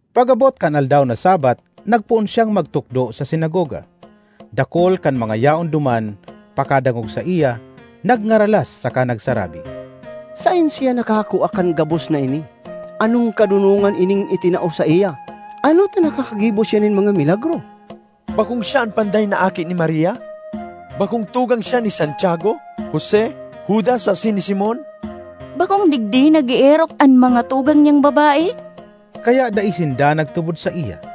Pag-abot kan aldaw na Sabbath nagpoon siyang magtukdo sa sinagoga. Dakul kan mga yaon duman, pakadangog saiya, nagngaralas saka nagsarabi, “Saen siya nakakua kan gabos na ini? Anong kadonongan ining itinao saiya? Ano ta nakakagibo siya nin mga milagro? Bakong siya an panday na aki ni Maria? Bakong tugang siya ni Santiago, Jose, Judas asin ni Simon? Bakong digdi nag-eerok an mga tugang niyang babae?” Kaya dai sinda nagtubod saiya.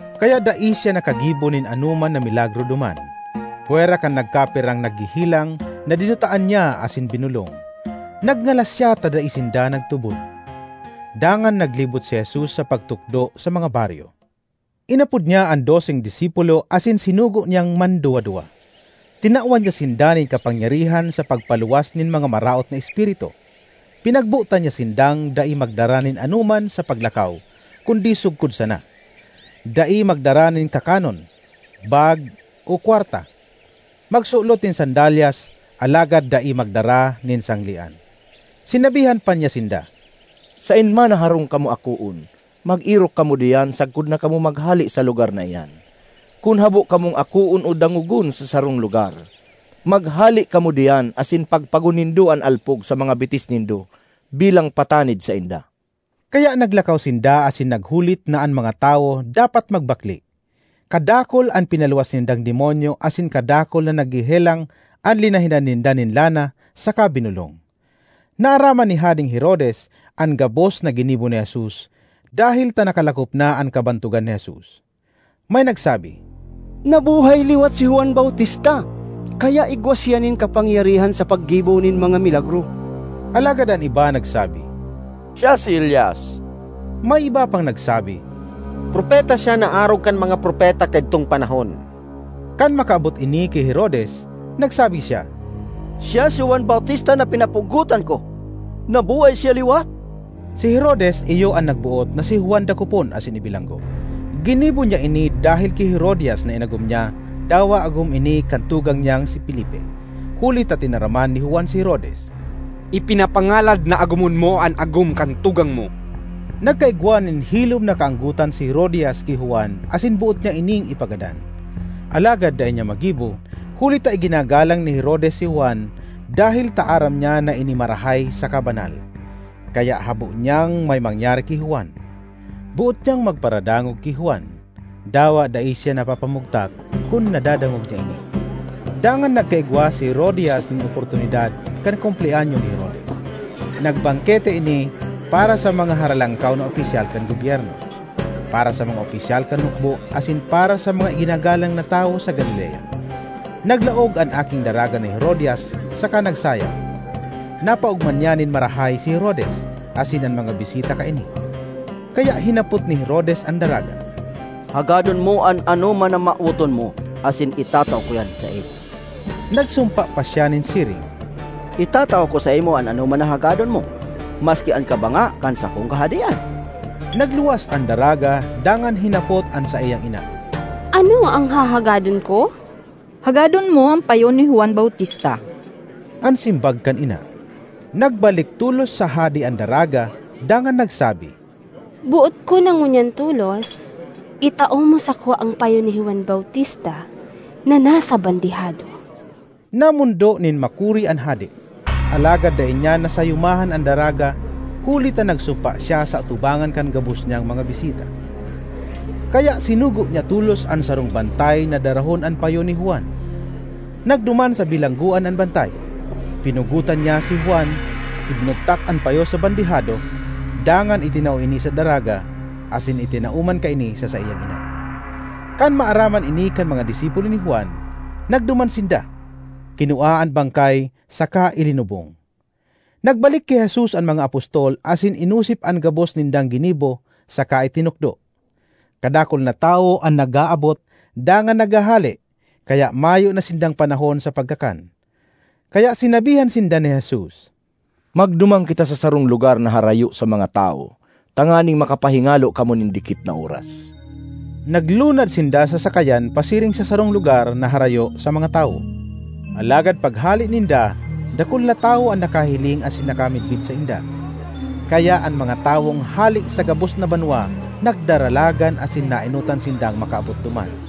Kaya dai siya nakagibo nin anoman na milagro duman, pwera kan nagkapirang naghehelang na dinutaan niya asin binolong. Nagngalas siya ta dai sinda nagtubod. Dangan naglibot si Jesus sa pagtukdo sa mga baryo. Inapod niya an doseng disipulo asin sinugo niyang manduwa-duwa. Tinawan niya sinda nin kapangyarihan sa pagpaluwas nin mga maraot na espiritu. Pinagbotan niya sindang dai magdara nin anoman sa paglakaw kundi sugkod sana; dai magdara nin kakanon, bag, o kwarta; magsulot nin sandalyas alagad dai magdara nin sanglean. Sinabihan pa niya sinda, “Saen man na harong kamo akoon, mag-erok kamo diyan sagkod na kamo maghale sa lugar na iyan. Kun habo kamong akoon o dangogon sa sarong lugar, maghale kamo diyan asin pagpagon nindo an alpog sa mga bitis nindo bilang patanid sainda!” Kaya naglakaw sinda asin naghulit na an mga tawo dapat magbakle. Kadakul an pinaluwas nindang demonyo asin kadakul na naghehelang an linahidan ninda nin lana saka binolong. Naaraman ni Hadeng Herodes an gabos na ginibo ni Jesus dahel ta nakalakop na an kabantogan ni Jesus. May nagsabi, “Nabuhay liwat si Juan Bautista, kaya igwa siya nin kapangyarihan sa paggibo nin mga milagro.” Alagad an iba nagsabi, “Siya si Elias.” May iba pang nagsabi, “Propeta siya na arog kan mga propeta kaidtong panahon.” Kan makaabot ini ki Herodes, nagsabi siya, “Siya si Juan Bautista na pinapugotan ko; nabuhay siya liwat!” Si Herodes iyo an nagboot na si Juan dakopon asin ibilanggo. Ginibo niya ini dahel ki Herodias na inagom niya dawa agom ini kan tugang niyang si Felipe. Huli ta tinaraman ni Juan si Herodes, “Ipinapangalad na agomon mo an agom kan tugang mo!” Nagkaigwa nin hilom na kaanggotan si Herodias ki Juan asin boot niya ining ipagadan, alagad dai niya magibo, huli ta iginagalang ni Herodes si Juan dahel ta aram niya na ini marahay saka banal, kaya habo niyang may mangyari ki Juan. Boot niyang magparadangog ki Juan, dawa dai siya napapamugtak kun nadadangog niya ini. Dangan nagkaigwa si Herodias nin oportunidad kan kumpleanyo ni Herodes; nagbangkete ini para sa mga haralangkaw na opisyal kan gobyerno, para sa mga opisyal kan hukbo asin para sa mga iginagalang na tawo sa Galilea. Naglaog an aking daraga ni Herodias saka nagsayaw. Napaogma niya nin marahay si Herodes asin an mga bisita kaini. Kaya hinapot ni Herodes an daraga, “Hagadon mo an anoman na mawoton mo asin itatao ko iyan saimo.” Nagsumpa pa siya nin siring, “Itatao ko saimo an anoman na hagadon mo, maski an kabanga kan sakong kahadean!” Nagluwas an daraga dangan hinapot an saiyang ina, “Ano an hahagadon ko?” “Hagadon mo an payo ni Juan Bautista,” an simbag kan ina. Nagbalik tolos sa hade an daraga dangan nagsabi, “Boot ko na ngunyan tolos itao mo sako an payo ni Juan Bautista na nasa bandehado!” Namondo nin makuri an hade, alagad dai niya nasayumahan an daraga huli ta nagsumpa siya sa atubangan kan gabos niyang mga bisita. Kaya sinugo niya tolos an sarong bantay na darahon an payo ni Juan. Nagduman sa bilanggoan an bantay; pinugotan niya si Juan, ibinugtak an payo sa bandehado, dangan itinao ini sa daraga asin itinao man kaini sa saiyang ina. Kan maaraman ini kan mga disipulo ni Juan, nagduman sinda, kinua an bangkay saka ilinubong. Nagbalik ki Jesus an mga apostol asin inosip an gabos nindang ginibo saka itinukdo. Kadakul na tawo an nag-aabot dangan naghahale kaya mayo na sindang panahon sa pagkakan. Kaya sinabihan sinda ni Jesus, “Magduman kita sa sarong lugar na harayo sa mga tawo tanganing makapahingalo kamo nin dikit na oras.” Naglunad sinda sa sakayan pasiring sa sarong lugar na harayo sa mga tawo. Alagad paghale ninda, dakul na tawo an nakahiling asin nakamidbid sainda. Kaya an mga tawong hale sa gabos na banwa nagdaralagan asin naenotan sindang makaabot duman.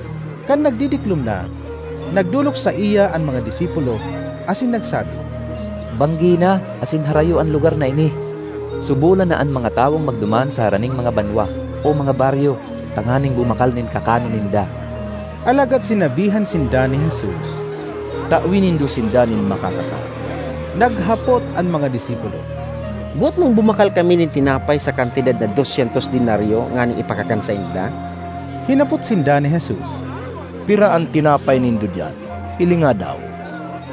Kan nagdidiklom na, nagdolok saiya an mga disipulo, asin nagsabi, “Banggi na asin harayo an lugar na ini. Subolan na an mga tawong magduman sa haraning mga banwa o mga baryo tanganing bumakal nin kakanon ninda.” Alagad sinabihan sinda ni Jesus, “Tawe nindo sinda nin makakakan.” Naghapot an mga disipulo, “Boot mong bumakal kami nin tinapay sa kantidad na dos syentos denaryo nganing ipakakan sainda?” Hinapot sinda ni Jesus, “Pira an tinapay nindo diyan? Hilinga daw.”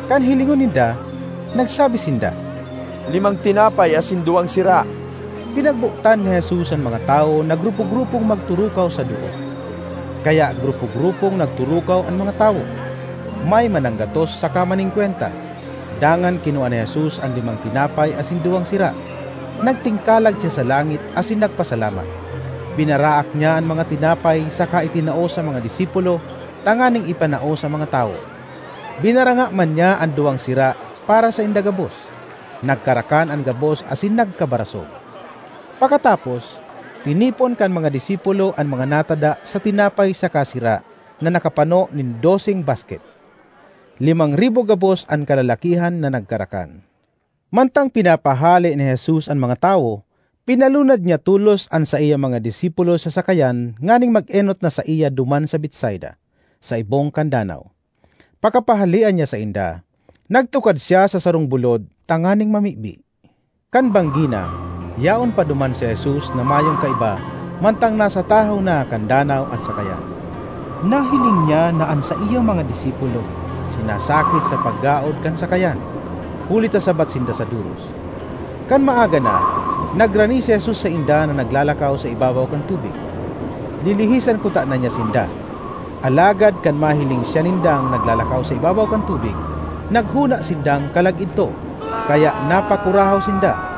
Kan hilingon ninda, nagsabi sinda, “Limang tinapay asin duwang sira.” Pinagbotan ni Jesus an mga tawo na grupo-grupong magturukaw sa doot. Kaya grupo-grupong nagturukaw an mga tawo, may mananggatos saka maningkwenta. Dangan kinua ni Jesus an limang tinapay asin duwang sira, nagtingkalag siya sa langit asin nagpasalamat, binaraak niya an mga tinapay saka itinao sa mga disipulo tanganing ipanao sa mga tawo. Binaranga man niya an duwang sira para sainda gabos. Nagkarakan an gabos asin nagkabarasog. Pakatapos, tinipon kan mga disipulo an mga natada sa tinapay saka sira na nakapano nin doseng basket. Limang ribo gabos an kalalakihan na nagkarakan. Mantang pinapahale ni Jesus an mga tawo, pinalunad niya tolos an saiyang mga disipulo sa sakayan nganing mag-enot na saiya duman sa Betsaida, sa ibong kan danaw. Pakapahalea niya sainda, nagtukad siya sa sarong bulod tanganing mamibi. Kan banggi na, yaon pa duman si Jesus na mayong kaiba mantang nasa tahaw na kan danaw an sakayan. Nahiling niya na an saiyang mga disipulo sinasakit sa paggaod kan sakayan, huli ta sabat sinda sa doros. Kan maaga na, nagrani si Jesus sainda na naglalakaw sa ibabaw kan tubig. Lilihisan kutana niya sinda, alagad kan mahiling siya nindang naglalakaw sa ibabaw kan tubig, naghona sindang kalag idto kaya napakurahaw sinda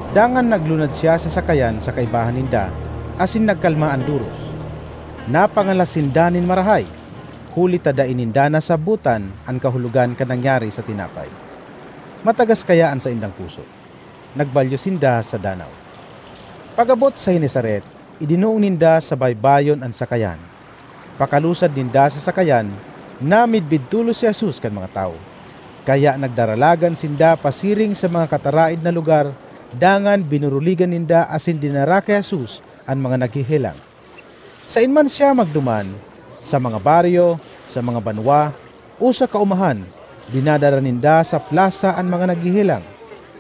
Dangan naglunad siya sa sakayan sa kaibahan ninda, asin nagkalma an doros. Napangalas sinda nin marahay, huli ta dai ninda nasabotan an kahulogan kan nangyari sa tinapay; matagas kaya an saindang puso. Nagbalyo sinda sa danaw. Pag-abot sa Genesaret idinoong ninda sa baybayon an sakayan. Pakalusad ninda sa sakayan, namidbid tolos si Jesus kan mga tawo, kaya nagdaralagan sinda pasiring sa mga kataraed na lugar dangan binuruligan ninda asin dinara ki Jesus an mga naghehelang. Saen man siya magduman, sa mga baryo, sa mga banwa o sa kaomahan, dinadara ninda sa plasa an mga naghehelang.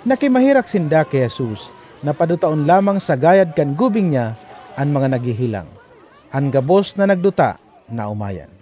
Nakimaherak sinda ki Jesus na padutaon lamang sa gayad kan gubing niya an mga naghehelang. An gabos na nagduta naomayan.